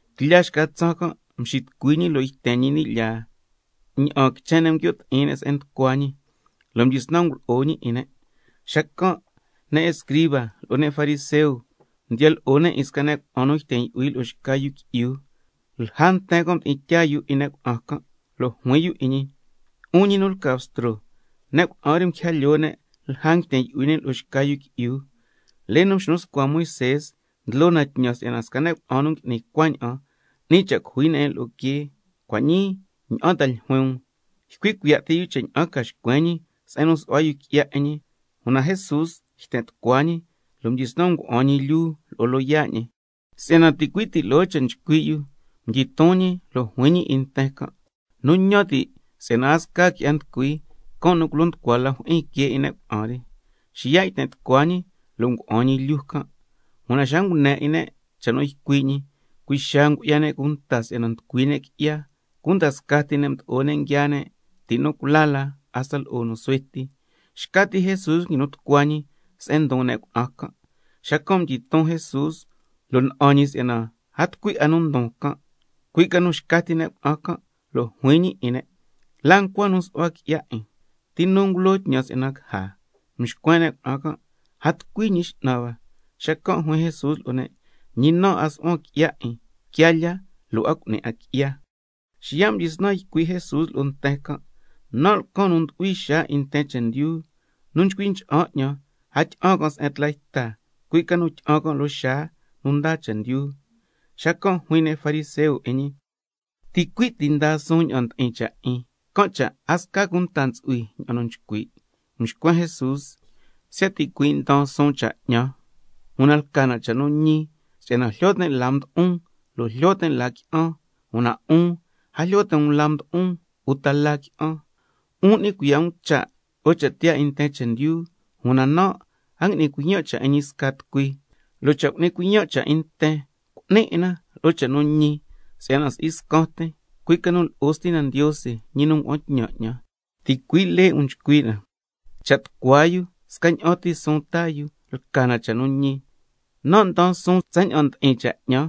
Tlya xca tsaan can' mxitucui ñi lo' yten ñi ni' lyaa, ña'aan quichen ne' nguio' ti'in ne' se'en nducua ñi, lo' mdyisnan ngulo'o ñi 'in ne'. Xacan' ne' escriba lo'o ne' fariseo mdiya lo'o yu 'in sca ne' cuna'an nu yten yu'hui lo'o xca yu qui'yu. Lja nten can' mdi'in tyaa yu 'in ne' cuna'an can'. Lo' juin yu 'in ñi: 'Un ñi nu lca Bstro, ne' cuna'an re nguija lyoo ne' lja nguiten yu'hui ne' lo'o xca yu qui'yu. Lee nu mxnu scua Moisé ndlo na tñan si'yana sca ne' cuna'an nu ngui'ni cuaña'an, 'ni cha' cujui ne' 'in lo'o quee. Cua' ñii, ¿ña'an ta ljuin um? Ycui' cuiya' ti yu cha' ña'an ca xcuen ñi se'en nu su'hua yu qui'ya 'in ñi. Una Jesús yten tucua ñi lo' mdyisnan ngua'an ñi lyuu lo'o loyaa' ñi. Si'yana ticui' ti loo cha' nchcui' yu, mdyiton ñi, lo' juin ñi 'in nten can': Nu ñan ti' si'yana a sca qui'ya nducui, can' nu culo nducua la jyi'in quee 'in ne' cuna'an re. Xiya' yten tucua ñi lo' ngua'an ñi lyuu can'. Una xa ngune 'in ne' cha' nu ycui' ñi, cui' xaa ngu'ya ne' cunta si'yana nducui ne' qui'ya, cunda scaa ti ne' mdo'o ne' nguiaa ne' ti' nu cula la hasta lo'o nu suhue ti. Xca ti Jesús nguinu tucua ñi se'en ndon ne' cuna'an can'. Xacan' mdyiton Jesús lo' na'an ñi si'yana a tucui 'a nu ndon can', cui' ca nu xca ti ne' cuna'an can', lo' juin ñi 'in ne': ¿La ncua nu nsu'hua qui'ya 'in? ¿Ti nu ngulo tñan si'yana caja? Mxcuen ne' cuna'an can': A tucui, Ñi X'nan hua. Xacan' juin Jesús lo'o ne': Ñi nan' a su'huan qui'ya 'in. Quiaa lya, lo' a cu'ni 'a qui'ya. Xiya' mdyisnan ycui' Jesús lo'o nten can': Nan' lcan nu ndu'hui xaa 'in nten chendyu. Nu chcui ncha'an 'ñan, a tyi'an 'a se'en tla yta, cui' ca nu tyi'an can' loo xaa nu ndaa chendyu. Xacan' juin ne' fariseo 'in ñi: Ticui' ti ndaa suun ña'an ndi'in cha' 'in, can' cha' a sca cunta ntsu'hui ña'an nu nchcui'. Mxcuen Jesús: Siya' ticuin' ndaan suun cha' 'ñan, una lca na cha' nu ñi, si'yana jlyo tin' la mdo'on, lo' jlyo tin' la qui'an, una 'un a jlyo ti' um la mdo'on uta la qui'an. 'Un n'ni cuiya' um cha' lo'o cha' tiyaa 'in nten chendyu, una nan' a ngui'nin cuiyan' cha' 'in ñi sca tucui. Lo' cha' cu'nin cuiyan' cha' 'in nten, cu'nin 'in na lo'o cha' nu ñi, si'yana si'i scan tin, cui' ca nu lo'o Stina Ndiose, ñi nu ngua'an tñan 'ñan. Ticui' lee 'in um nchcui' na, cha' tucua yu scaña'an ti suun taa yu, lca na cha' nu ñi. Nan' ndaan suun tsaña'an ndi'in cha' 'ñan,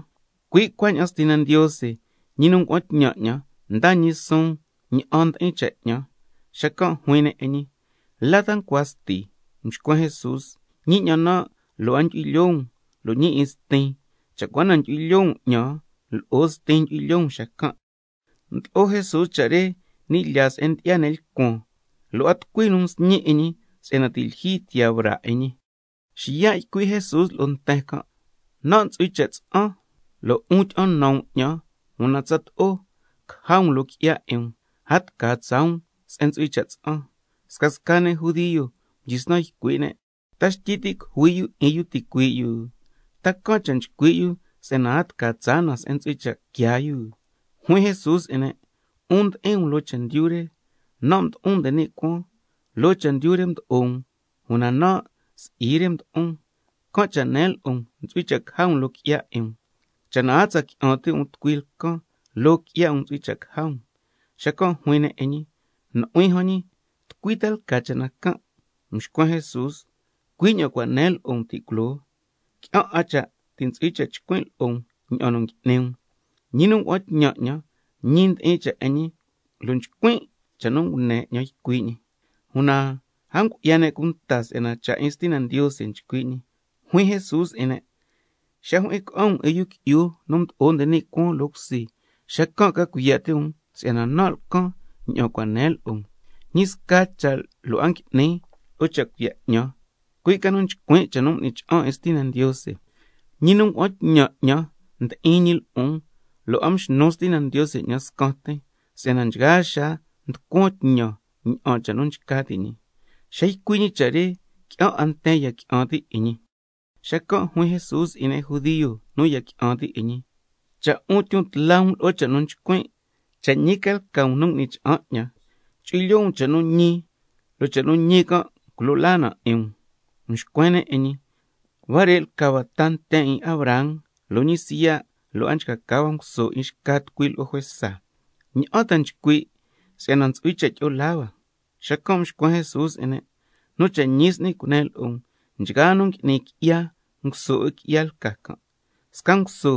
cui' cuaña'an Stina Ndiose, ñi nu ngua'an tñan 'ñan, ndaa ñi suun ña'an ndi'in cha' 'ñan. Xacan' juin ne' 'in ñi: ¿La ta ncua Sti? Mxcuen Jesús: Ñi 'ñan nan', lo' a ndyu'hui lyoo um, lo' ñi 'in Stin. Cha' cua na ndyu'hui lyoo um 'ñan, lo'o Stin ndyu'hui lyoo um xacan'. Ndlo'o Jesús cha' re ni' lyaa se'en ndyi'ya ne' lcuan, lo' a tucui nu msñi 'in ñi si'yana ti' lyijyi tiyaa braa 'in ñi. Xiya' ycui' Jesús lo'o nten can': Nan' ntsu'hui cha' tsa'an, lo' 'un tyi'an nan um 'ñan, una tsato'o caja um loo qui'ya 'in um, can' cha' a tca tsaa um se'en ntsu'hui cha' tsa'an. Scasca ne' judio mdyisnan ycui' ne': ¿Ta xtyi ti' cujui yu 'in yu ticuii' yu? ¿Ta can' cha' nchcui' yu si'yana a tca tsaa na se'en ntsu'hui cha' quiaa yu? Juin Jesús 'in ne': 'Un ndi'in loo chendyu re, nan' mdo'on nde ni' cuaan. Loo chendyu re mdo'o um, una nan' si'i re mdo'on. Can' cha' nen lo'o um ntsu'hui cha' caja um loo qui'ya 'in um. Cha' na a tsa qui'an ti' um tucui lcan, loo qui'ya 'in um ntsu'hui cha' caja um. Xacan' juin ne' 'in ñi: Nu'huin jan ñi, ¿tucui ta lca cha' na can'? Mxcuen Jesús: Cui' ña'an cua' nen lo'o um ti' culoo. Qui'an 'a cha' ti' ntsu'hui cha' chcuin' lo'o ña'an nu ngui'ni um. Ñi nu ngua'an tñan 'ñan, ñi ndi'in cha' 'in ñi, lo' nchcuin' cha' nu ngune 'ñan ycui' ñi. Una a ngu'ya ne' cunta si'yana cha' 'in Stina Ndiose nchcui' ñi. Xacan' juin Jesús 'in ne': Xa jyi'in ca'an um 'in Yu Qui'yu nu Mdo'o nde ni' Cuaan loo cusi, xacan' ca cuiya' ti' um si'yana nan' lcan ña'an cua' nen lo'o um, ñi sca cha' lo' a ngui'nin lo'o cha' cuiya' nu 'ñan, cui' ca nu nchcuin' cha' nu m'ni cha'an 'in Stina Ndiose. Ñi nu ngua'an tñan 'ñan ndi'in ñi lo'on, lo' a mxnu Stina Ndiose 'ñan scan tin, si'yana nchgaa xaa nducuan tñan ña'an cha' nu nchca ti' ñi. Xa ycui' ñi cha' re, qui'an 'a nten ya qui'an ti' 'in ñi. Xacan' juin Jesús 'in ne' judio nu ya qui'an ti' 'in ñi: Cha' 'un tyon tla um lo'o cha' nu nchcuin', cha' ñi ca lca um nu ngui'ni cha'an 'ñan, chu'hui lyoo um cha' nu ñi, lo' cha' nu ñi can' culo laa na 'in um. Mxcuen ne' 'in ñi: Huare' lca hua ta nten 'in Abraham, lo' ñi siya' lo' a nchca ca hua nguso 'in xca tucui lo'o juesa, ¿ña'an ta nchcui' si'yana ntsu'hui cha' tyi'o laa hua? Xacan' mxcuen Jesús 'in ne': Nu cha' ñi s'ni cunen lo'o um, nchgaa nu ngui'ni qui'ya, nguso 'in qui'ya lca can'. Sca nguso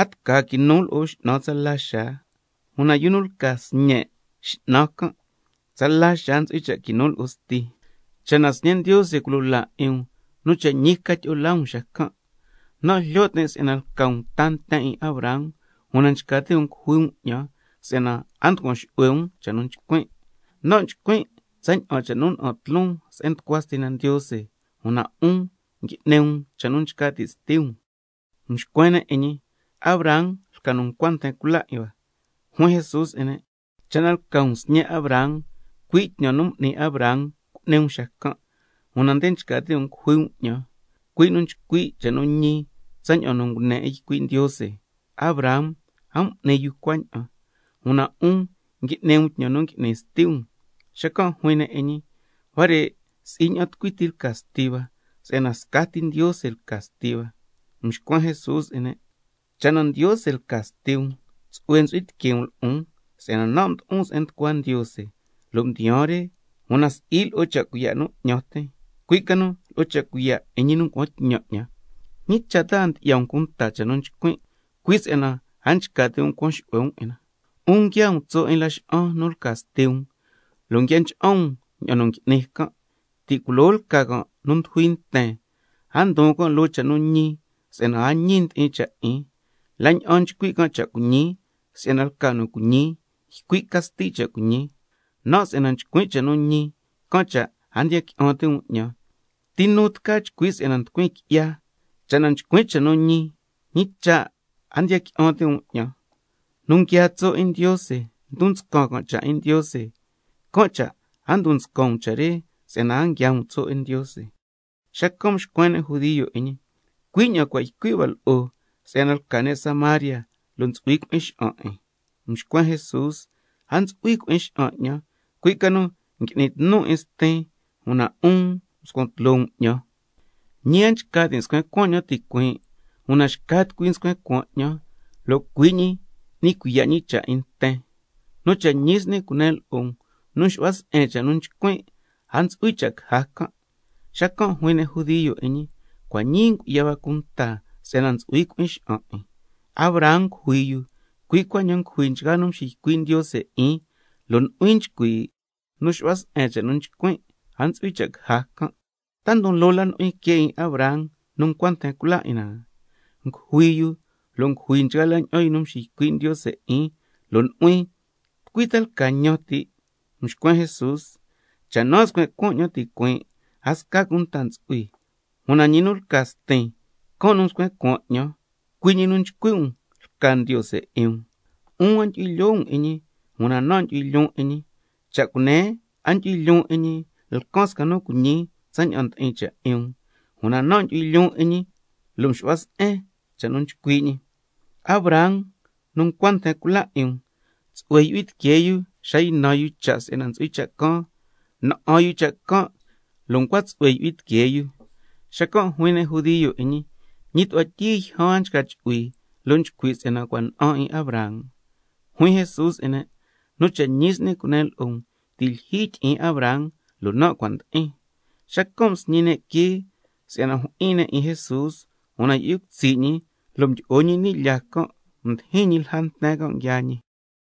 a tca quinu lo'o x'nan tsala xaa, una yu nu lca sñe' x'nan can', tsala xaa ntsu'hui cha' quinu lo'o sti. Can' cha', cha' na Sñe' Ndiose culo laa 'in um, nu cha' ñi ca tyi'o laa um xacan'. Nan' jlyo tin' si'yana lca um ta nten 'in Abraham, una nchca ti' um cujui um 'ñan, si'yana a nducuan xu'hue um cha' nu nchcuin'. Nan' nchcuin' tsaña'an cha' nu na'an tloon se'en nducua Stina Ndiose, una 'un ngui'ni um cha' nu nchcui' sti um. Mxcuen ne' 'in ñi: Abraham lca nu ncua nten cula 'in hua. Xacan' juin Jesús 'in ne': Cha' na lca um sñe' Abraham, cui' tñan nu m'ni Abraham cu'ni um xacan'. Una nde nchca ti' um cujui um 'ñan, cui' nu nchcui' cha' nu ñi tsaña'an nu ngune 'in ycui' Ndiose. Una Abraham a m'ni yu cuaña'an. Una 'un ngui'ni um tñan nu ngui'ni sti um. Xacan' juin ne' 'in ñi: Una huare' si'i ña'an tucui ti lca sti hua, si'yana scati Ndiose lca sti hua. Xacan' mxcuen Jesús 'in ne': Cha' na Ndiose lca sti um, tsu'hue ntsu'hui tiquee um lo'on, si'yana nan' mdo'on se'en nducua Ndiose lo' mdiyaan re, una si'i lo'o cha' cuiya' nu 'ñan tin, cui' ca nu lo'o cha' cuiya' 'in ñi nu ngua'an tñan 'ñan. ¿Ñi cha' a ndyi'ya um cunta cha' nu nchcuin'? Cui' si'yana a nchca ti' um cuan xu'hue um 'in na. 'Un nguiaa um tso' 'in laxa'an nu lca sti um, lo' nguia ncha'an um ña'an nu ngui'ni can'. Ti' culoo lca can' nu ndujui nten, a ndon can' loo cha' nu ñi si'yana a ñi ndi'in cha' 'in, la' ña'an nchcui' can' cha' cuiñi si'yana lca nu cuiñi, ycui' ca sti cha' cuiñi. Nan' si'yana nchcuin' cha' nu ñi, can' cha' a ndiya qui'an ti' um 'ñan. ¿Ti nu tca chcui' si'yana nducuin qui'ya? Cha' na nchcuin' cha' nu ñi, ¿ñi cha' a ndiya qui'an ti' um 'ñan? Nu nguiaa tso' 'in Ndiose ndon nscan cha' 'in Ndiose, can' cha' a ndon nscan um cha' re si'yana a nguiaa um tso' 'in Ndiose. Xacan' mxcuen ne' judio 'in ñi: Cui' ña'an cua' ycui' hua lo'o si'yana lca ne' Samaria, lo' ntsu'hui cui'in xa'an 'in. Mxcuen Jesús: A ntsu'hui cui'in xa'an 'ñan. Cui' ca nu ngui'nin tnun 'in Stin, una 'un nxcuan tloo um 'ñan. Ñi a nchca tin' scuen cuaan 'ñan ticuiin', una xca tucui nscuen cuaan 'ñan, can' nu cu'ni cuiya' cha' 'ñan. Nu cha' ñi s'ni cunen lo'o um, nu xu'hua se'en cha' nu nchcuin', a ntsu'hui cha' caja can'. Xacan' juin ne' judio 'in ñi: Cua' ñii ngu'ya hua cunta si'yana ntsu'hui cui'in xa'an 'in. Abraham ngujui yu, cui' cuaña'an ngujui nchgaa la ña'an yu nu mxiycui' Ndiose 'in, lo' nu'huin nchcui': Nu xu'hua se'en cha' nu nchcuin', a ntsu'hui cha' caja can'. ¿Ta ndon loo la nu'huin que 'in Abraham nu ncua nten cula 'in na? Ngujui yu lo' ngujui nchgaa la ña'an yu nu mxiycui' Ndiose 'in, lo' nu'huin, ¿tucui ta lca ñan ti'? Mxcuen Jesús: Cha' nan' scuen cuaan 'ñan ticuiin', a sca cunta ntsu'hui, una ñi nu lca Stin, can' nu nscuen cuaan 'ñan, cui' ñi nu nchcui' um lca Ndiose 'in um. 'Un a ndyu'hui lyoo um 'in ñi, una nan' ndyu'hui lyoon 'in ñi. Cha' cunen a ndyu'hui lyoon 'in ñi, lcan sca nu cuiñi tsaña'an ndi'in cha' 'in um. Una nan' ndyu'hui lyoon 'in ñi lo' nxu'hua se'en cha' nu nchcui' ñi. Abraham nu ncua nten cula 'in um, tsu'hue yu'hui tiquee yu xa ynan yu cha' si'yana ntsu'hui cha' caan, na'an yu cha' can' lo' ncua tsu'hue yu'hui tiquee yu. Xacan' juin ne' judio 'in ñi: Ñi tu'hua tyii yjan a nchca chu'hui, lo' nchcui' si'yana cua' na'an 'in Abraham. Juin Jesús 'in ne': Nu cha' ñi s'ni cunen lo'o um, ti' lyijyi tyi'in Abraham lo' nan' cua' ndi'in. Xacan' msñi ne' quee si'yana jyi'in ne' 'in Jesús, una yu'hui cutsi' ñi lo' mdyi'o ñi ni' lyaa can', mdijin ñi lja nten can' nguiaa ñi.